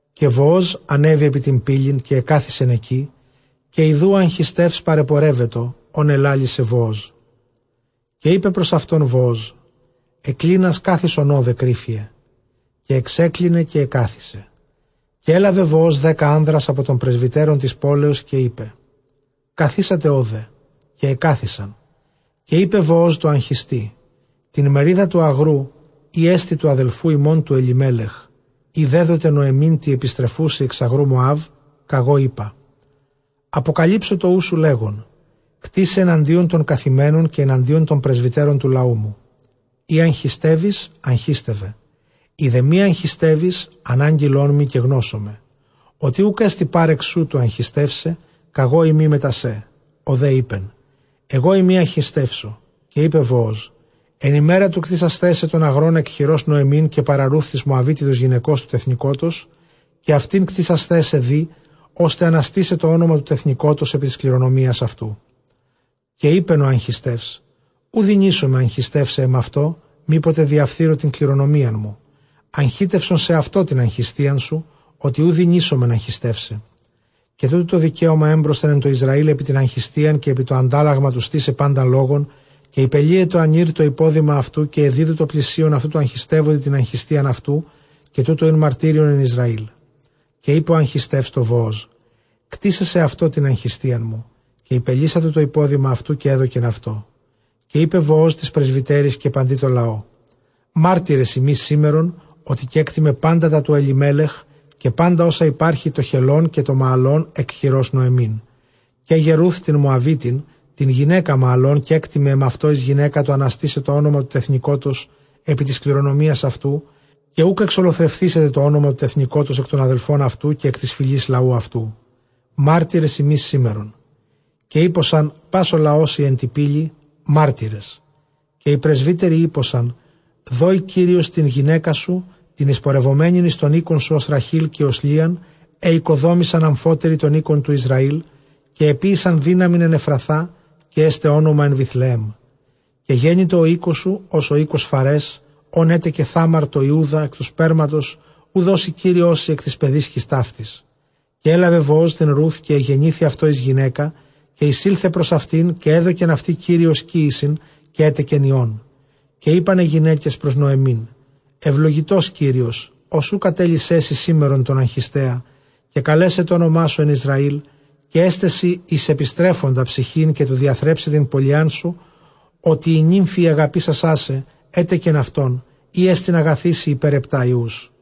Καὶ Βοὸζ ἀνέβη ἐπὶ τὴν πύλην, και ἐκαθισεν ἐκεῖ, καὶ ἰδοὺ ὁ ἀγχιστεὺς παρεπορεύετο, ὃν ἐλάλησε Βοόζ· καὶ εἶπε πρὸς αὐτὸν Βοὸζ, ἐκκλίνας κάθισον ὧδε κρύφιε· καὶ ἐξέκλινε καὶ ἐκάθισε. Καὶ ἔλαβε Βοὸζ δέκα ἄνδρας ἀπὸ τῶν πρεσβυτέρων τῆς πόλεως, καὶ εἶπε, καθίσατε ὧδε· καὶ ἐκάθισαν. Καὶ εἶπε Βοὸζ τῷ ἀγχιστεῖ, τὴν μερίδα τοῦ ἀγροῦ ἥ ἐστι τοῦ ἀδελφοῦ ἡμῶν τοῦ Ἐλιμέλεχ, ἣ δέδοται Νωεμὶν τῇ ἐπιστρεφούσῃ ἐξ ἀγροῦ Μωὰβ, κᾀγὼ εἶπα, ἀποκαλύψω τὸ οὖς σου λέγων, κτῆσαι ἐναντίον τῶν καθημένων, καὶ ἐναντίον τῶν πρεσβυτέρων τοῦ λαοῦ μου. εἰ ἀγχιστεύεις, ἀγχίστευε· εἰ δὲ μὴ ἀγχιστεύεις, ἀνάγγειλόν μοι, καὶ γνώσομαι, ὅτι οὐκ ἔστι πάρεξ σοῦ τοῦ ἀγχιστεῦσαι, κᾀγώ εἰμι μετὰ σέ· ὁ δὲ εἶπεν, ἐγώ εἰμι, ἀγχιστεῦσαι, κἀγώ εἰμι, ἀγχιστεύσω. Καὶ εἶπε Βοὸζ, ἐν ἡμέρᾳ τοῦ κτήσασθαί σε τὸν ἀγρὸν ἐκ χειρὸς Νωεμὶν καὶ παρὰ Ῥοὺθ τῆς Μωαβίτιδος γυναικὸς τοῦ τεθνηκότος, καὶ αὐτὴν κτήσασθαί σε δεῖ, ὥστε ἀναστῆσαι τὸ ὄνομα τοῦ τεθνηκότος ἐπὶ τῆς κληρονομίας αὐτοῦ. Καὶ εἶπεν ὁ ἀγχιστεὺς, οὐ δυνήσομαι ἀγχιστεῦσαι ἐμαυτῷ, μή ποτε διαφθείρω τὴν κληρονομίαν μου· ἀγχίστευσον σεαυτῷ τὴν ἀγχιστείαν μου, ὅτι οὐ δυνήσομαι ἀγχιστεῦσαι. Καὶ τοῦτο τὸ δικαίωμα ἔμπροσθεν ἐν τῷ Ἰσραὴλ ἐπὶ τὴν ἀγχιστείαν, καὶ ἐπὶ τὸ ἀντάλλαγμα τοῦ στῆσαι πάντα λόγον· καὶ ὑπελύετο ἀνὴρ τὸ ὑπόδημα αὐτοῦ, καὶ ἐδίδου τῷ πλησίον αὐτοῦ τῷ ἀγχιστεύοντι τὴν ἀγχιστείαν αὐτοῦ· καὶ τοῦτο ἦν μαρτύριον ἐν Ἰσραήλ. Καὶ εἶπεν ὁ ἀγχιστεὺς τῷ Βοὸζ, κτῆσαι σεαυτῷ τὴν ἀγχιστείαν μου· καὶ ὑπελύσατο τὸ ὑπόδημα αὐτοῦ, καὶ ἔδωκεν αὐτῷ. Καὶ εἶπε Βοὸζ τοῖς πρεσβυτέροις καὶ παντὶ τῷ λαῷ, μάρτυρες ὑμεῖς σήμερον, ὅτι κέκτημαι πάντα τὰ τοῦ Ἐλιμέλεχ, καὶ πάντα ὅσα ὑπάρχει τῷ Χελαιὼν καὶ τῷ Μααλὼν ἐκ χειρὸς Νωεμίν. Καί γε Ῥοὺθ τὴν Μωαβίτιν τὴν γυναῖκα Μααλὼν κέκτημαι ἐμαυτῷ εἰς γυναῖκα, τοῦ ἀναστῆσαι τὸ ὄνομα τοῦ τεθνηκότος ἐπὶ τῆς κληρονομίας αὐτοῦ, καὶ οὐκ ἐξολοθρευθήσεται τὸ ὄνομα τοῦ τεθνηκότος ἐκ τῶν ἀδελφῶν αὐτοῦ, καὶ ἐκ τῆς φυλῆς λαοῦ αὐτοῦ· μάρτυρες ὑμεῖς σήμερον. Καὶ εἴποσαν πᾶς ὁ λαὸς οἱ ἐν τῇ πύλῃ, μάρτυρες· καὶ οἱ πρεσβύτεροι εἴποσαν, δῴη Κύριος τὴν γυναῖκά σου, τὴν εἰσπορευομένην εἰς τὸν οἶκόν σου, ὡς Ῥαχὴλ καὶ ὡς Λίαν, αἳ ᾠκοδόμησαν ἀμφότεραι τὸν οἶκον τοῦ Ἰσραὴλ, καὶ ἐποίησαν δύναμιν ἐν Ἐφραθᾷ, καὶ ἔσται ὄνομα ἐν Βηθλεέμ. Καὶ γένοιτο οἶκός σου, ὡς οἶκος Φαρὲς, ὃν ἔτεκε Θάμαρ τῷ Ἰούδᾳ, ἐκ τοῦ σπέρματος οὗ δώσει Κύριός σοι ἐκ τῆς παιδίσκης ταύτης. Καὶ ἔλαβε Βοὸζ τὴν Ῥοὺθ, καὶ ἐγενήθη αὐτῷ εἰς γυναῖκα, καὶ εἰσῆλθε πρὸς αὐτήν. καὶ ἔδωκεν αὐτῇ Κύριος κύησιν, καὶ ἔτεκεν υἱόν. Καὶ εἶπαν αἱ γυναῖκες πρὸς Νωεμὶν, εὐλογητὸς Κύριος, ὃς οὐ κατέλυσέ σοι σήμερον τὸν ἀγχιστέα, καὶ καλέσαι τὸ ὄνομά σου ἑν Ἰσραήλ. Καὶ ἔσται σοι εἰς ἐπιστρέφοντα ψυχὴν, καὶ τοῦ διαθρέψαι τὴν πολιάν σου, ὅτι ἡ νύμφη ἡ ἀγαπήσασά σε, ἔτεκεν αὐτὸν, ἥ ἐστιν ἀγαθή σοι ὑπὲρ ἑπτὰ υἱούς.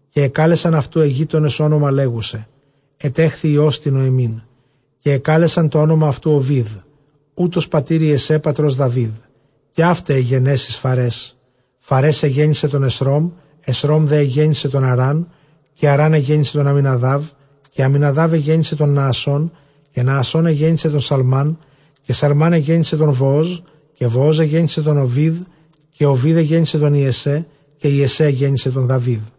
Καὶ ἐκάλεσαν αὐτοῦ αἱ γείτονες ὄνομα, λέγουσαι, ἐτέχθη υἱὸς τῇ Νωεμίν. καὶ ἐκάλεσαν τὸ ὄνομα αὐτοῦ, Ὠβήδ· οὗτος πατὴρ Ἰεσσαὶ πατρὸς Δαυίδ. Καὶ αὗται αἱ γενέσεις Φαρές. Φαρές ἐγέννησε τὸν Ἐσρώμ· Ἐσρὼμ ἐγέννησε τὸν Ἀράμ· καὶ Ἀρὰμ ἐγέννησε τὸν Ἀμιναδάβ· Καὶ Ἀμιναδὰβ ἐγέννησε τὸν Ναασσών· καὶ Ναασσὼν ἐγέννησε τὸν Σαλμών· Καὶ Σαλμὼν ἐγέννησε τὸν Βοόζ· καὶ Βοὸζ ἐγέννησε τὸν Ὠβήδ· Καὶ Ὡβὴδ ἐγέννησε τὸν Ἰεσσαί· καὶ Ἰεσσαὶ ἐγέννησε τὸν Δαυίδ.